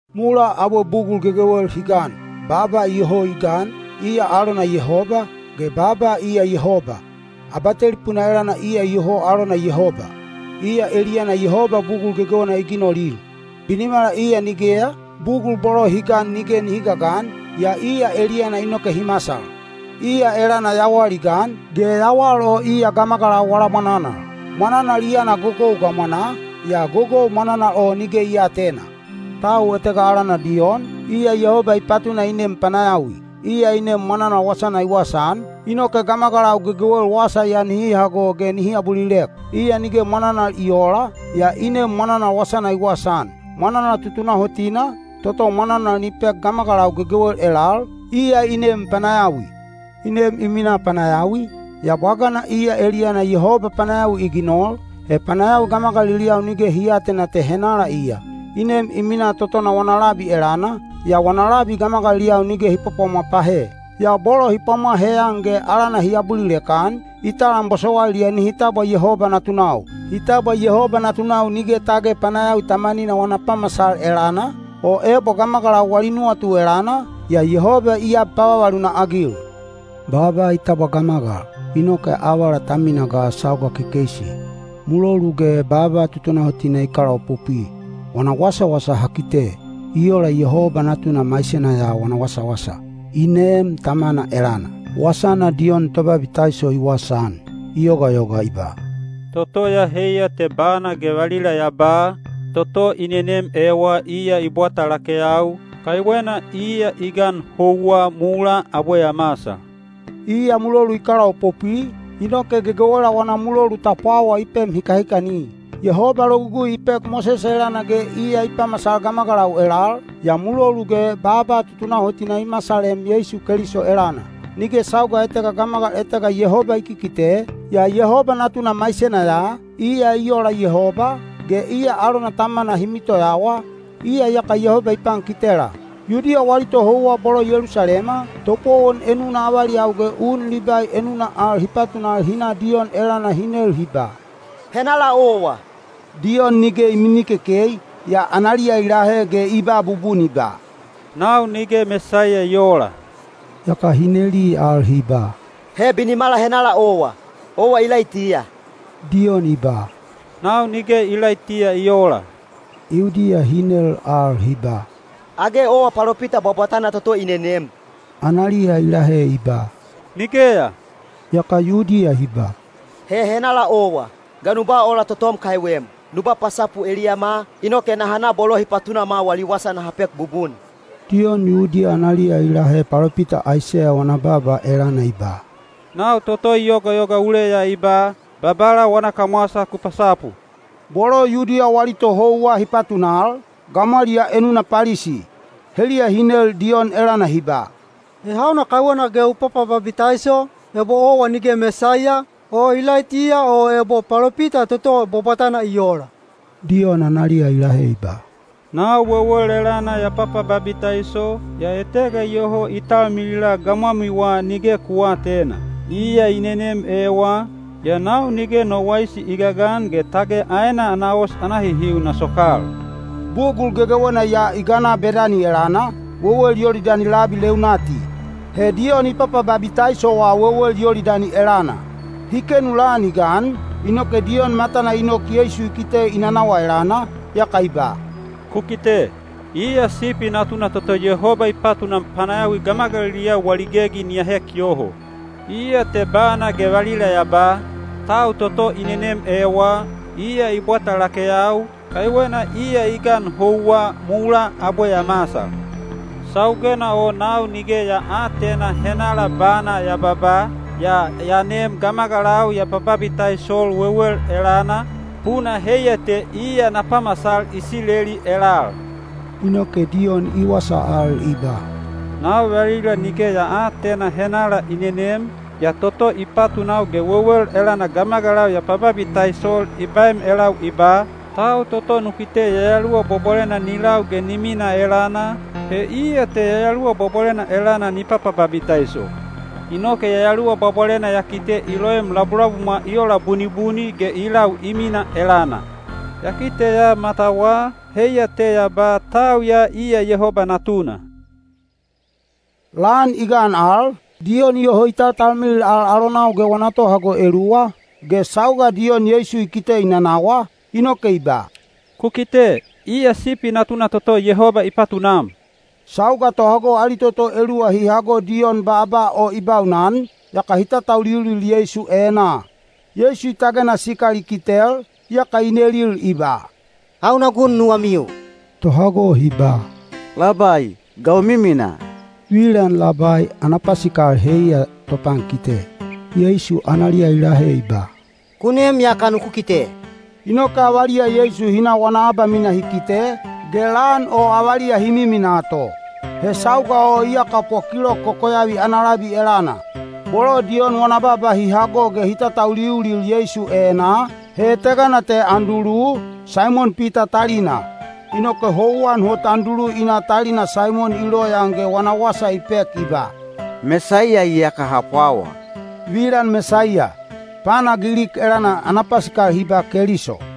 Mulaa abwe bugul gegewel hi gan, Baaba iyoho i gan, iya alona Yehoba, ge Baaba iya Yehoba. Abatelipuna elana iya iyoho alona Yehoba. Iya eliyana Yehoba bugul gegewena i ginolil. Binimala iya nigeya, bugul bolo hi gan nige nihi gagan, yaa iya eliyana inoke hi masal. Iya elana yawal i gan, ge yawal o iya gamagalau wala mwananal. Mwananal i yana gogou gamwanaa, yaa gogou mwananal o nige i aatena. Tau etega alana Diyon, iya Yehoba i patuna i nem panayawi. Iya i nem mwananal wasana i wasaan, inoke gamagalau gegewel wasa ya nihi hago ge nihi abulilek. Iya nige mwananal i oola, yaa i nem mwananal wasana i wasaan. Mwananal tutunahotina, toto mwananal ni pek gamagalau gegewel elal, iya i nem panayawi. I nem i minaa panayawi, yaa bwagana iya eliyana Yehoba panayawi i ginol, he panayawi gamagaliliyau nige hi aatena te henala iya. I nem i minaa totona wana labi elana, yaa wana labi gamagaliliyau nige hi pwapwamwa pahe. Yaa bolo hi pwamwa heyan ge alana hi abulilek-an, i talam bosowailiya nihi tabwa Yehoba natunau. Hi tabwa Yehoba natunau nige tage panayawi tamanina wana pamasal elana, o ebo gamagalau wali nuwatu elana, yaa Yehoba i ab pavavaluna-agil. Baaba i tabwa gamagal, inoke avala ta mina ga sauga kekeisi, mulolu ge baaba tutunahotina i kalaopopwi. Wana wasawasa ha kite, i ola Yehoba Natuna maisena ya wana wasawasa, i neem Tamana elana. Wasana Diyon Tobabitaiso i wasaan, i yogayoga i ba, “Toto ya heiya te bana ge valila ya ba, ‘Toto i nenem ewa iya i bwata lakeyau, kaiwena iya i gan houwa mulaa abwe ya masal.’” Iya mulolu i kalaopopwi, inoke gegewela wana mulolu ta pwawa i pem hikahikani. Yehoba Logugui i pek Mosese elana ge iya i pamasal gamagalau elal, yaa mulolu ge baaba tutunahotina i masalem Yeisu Keliso elana. Nige sauga etega gamagal etega Yehoba i kikite, yaa Yehoba Natuna maisena ya, iya i ola Yehoba, ge iya alona Tamana hi mitoyawa, iya iyaka Yehoba i pankitela. Yudiya wali tohouwa bolo Yelusalema, topowon enuna avaliyau ge un Libai enuna al hi patunal hi na Diyon elana hi nel hi ba, “Henala owa?” Diyon nige i mimikekei, yaa analiya i lahe ge i ba bubun i ba, “Nau nige Mesaiya i oola.” Yaka hi neli al hi ba, “He binimala henala owa? Owa Ilaitiya?” Diyon i ba, “Nau nige Ilaitiya i oola.” Yudiya hi nel al hi ba, “Age owa palopita bwabwatana toto i nenem?” Analiya i lahe i ba, “Nigeya.” Yaka Yudiya hi ba, “He henala owa? Ga nu ba ola totom kaiwem? Nu ba pasapu eliyama, inoke naha na bolo hi patunama wali wasa naha pek bubun.” Diyon Yudiya analiya i lahe palopita Aiseya wana baaba elana i ba, “Nau toto i yogayoga uleya i ba, ‘Babala wana kamwasa ku pasapu.’” Bolo Yudiya wali tohouwa hi patunal, gamwaliyaa enuna Palisi. Heliya hi nel Diyon elana hi ba, “He hauna kaiwena ge u papababitaiso, ebo owa nige Mesaiya, o Ilaitiya o ebo palopita toto bwabwatana i oola?” Diyon analiya i lahe i ba, “Nau wewel elana ya papababitaiso, yaa etega iyoho i talmilila gamwamiwa nige ku aatena. Iya i nenem ewa, yaa nau nige no waisi i gagan ge tage aena ana os ana hihiu na sokal.” Bugul gegewena ya i gana Bedani elana, wewel Yolidani labi leunati. He Diyon i papababitaisowa wewel Yolidani elana. Hi kenu lan i gan, inoke Diyon matana i nok Yeisu i kite i nanawa elana, yaka i ba, “Ku kite! Iya Sipi Natuna toto Yehoba i patunam panayawi gamagaliliyau wali gegi ni ahek yoho! Iya te bana ge valila ya ba, ‘Tau toto i nenem ewa, iya i bwata lakeyau, kaiwena iya i gan houwa mulaa abwe ya masal.’ Saugena o nau nige ya aatena henala bana ya babaa, yaa ya nem gamagalau ya pababitaisol wewel elana, puna heiya te iya na pamasal Isileli elal.” Inoke Diyon i wasa al i ba, “Nau valila nige ya aatena henala i nenem, yaa toto i patunau ge wewel elana gamagalau ya pababitaisol i baem elau i ba, ‘Tau toto nu kite Yayaluwa Bwabwalena ni lau ge ni minaa elana, he iya te Yayaluwa Bwabwalena elana ni papababitaiso.’ Inoke Yayaluwa Bwabwalena ya kite i loem labulabumwa i ola bunibuni ge i lau i minaa elana. Ya kiteya matawa, heiya te ya ba, ‘Tau ya iya Yehoba Natuna.’” Lan i gan al, Diyon iyoho i taltalmilil al alonau ge wana tohago eluwa, ge sauga Diyon Yeisu i kite i nanawa, inoke i ba, “Ku kite! Iya Sipi Natuna toto Yehoba i patunam!” Sauga tohago ali toto eluwa hi hago Diyon baaba o i baunan, yaka hi tatauliulil Yeisu enaa. Yeisu i tagena sikal i kitel, yaka i nelil i ba, “Hauna gun nuwamiu?” Tohago hi ba, “Labai, ga u miminaa?” (Vilan “Labai” ana pasikal heiya “topankite.”) Yeisu analiya i lahe i ba, “Ku nem yaka nuku kite.” Inoke avaliya Yeisu hi na wana abamina hi kite, ge lan o avaliya hi miminaa to. He sauga o iyaka po kilok kokoyavi ana labi elana. Bolo Diyon wana baaba hi hago ge hi tatauliulil Yeisu enaa, he etegana te Andulu, Saimon Pita talina. Inoke houwan hot Andulu i na talina Saimon i loyaan ge wana wasa i pek i ba, “Mesaiya iyaka ha pwawa.” (Vilan “Mesaiya” pana Gilik elana hi ba “Keliso.”)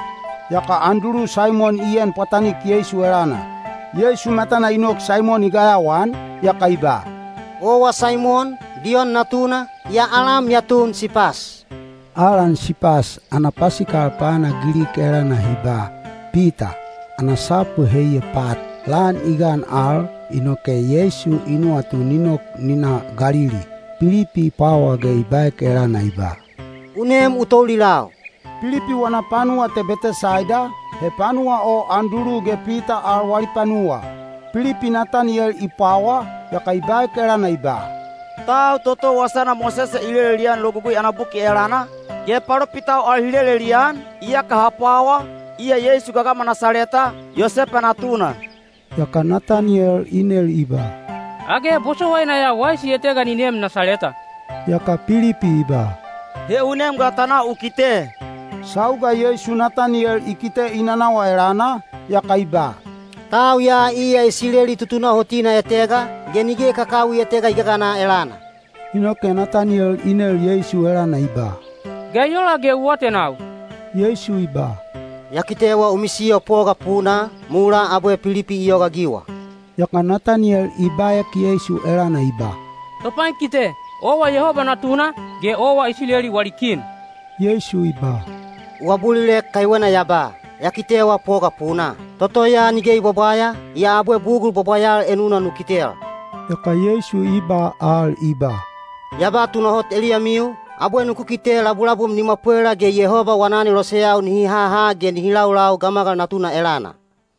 Yaka Andulu Saimon i en pwatanik Yeisu elana. Yeisu matana i nok Saimon i gayawaan, yaka i ba, “Owa Saimon, Diyon natuna, yaa alam ya tun Sipas.” (Alan “Sipas” ana pasikal pana Gilik elana hi ba “Pita,” ana sapu heiya “pat.”) Lan i gan al, inoke Yeisu i nuwatu ni nok ni na Galili. Pilipi i pwawa ge i baek elana i ba, “U nem u toulilau.” Pilipi wana panuwa te Betesaida, he panuwa o Andulu ge Pita al wali panuwa. Pilipi Nataniyel i pwawa, yaka i baek elana i ba, “Tau toto wasana Mosese i lelelian Logugui ana buki elana, ge palopitau al hi lelelian, iyaka ha pwawa, iya Yeisu gagama Nasaleta, Yosepa natuna.” Yaka Nataniyel i nel i ba, “Age bosowaina ya waisi etega ni neem Nasaleta?” Yaka Pilipi i ba, “He u nem ga ta na u kite.” Sauga Yeisu Nataniyel i kite i nanawa elana, yaka i ba, “Tau ya iya Isileli tutunahotina etega, ge nige kakawi etega i gagana elana.” Inoke Nataniyel i nel Yeisu elana i ba, “Ga i ola ge u atenau?” Yeisu i ba, “Ya kitewa u misiyo poga punaa, mulaa abwe Pilipi i yogaagiwa.” Yaka Nataniyel i baek Yeisu elana i ba, “Topankite, owa Yehoba Natuna, ge owa Isileli wali kin!” Yeisu i ba, “U abulilek kaiwena ya ba, ‘Ya kitewaa poga punaa.’ Toto ya nige i bwabwaya, yaa abwe bugul bwabwayal enuna nu kitel.” Yaka Yeisu i ba al i ba, “Ya ba tunahot eliyamiu, abwe nuku kite labulabum ni mwapwela ge Yehoba wana aneloseyau nihi haha ge nihi laulau Gamagal Natuna elana.”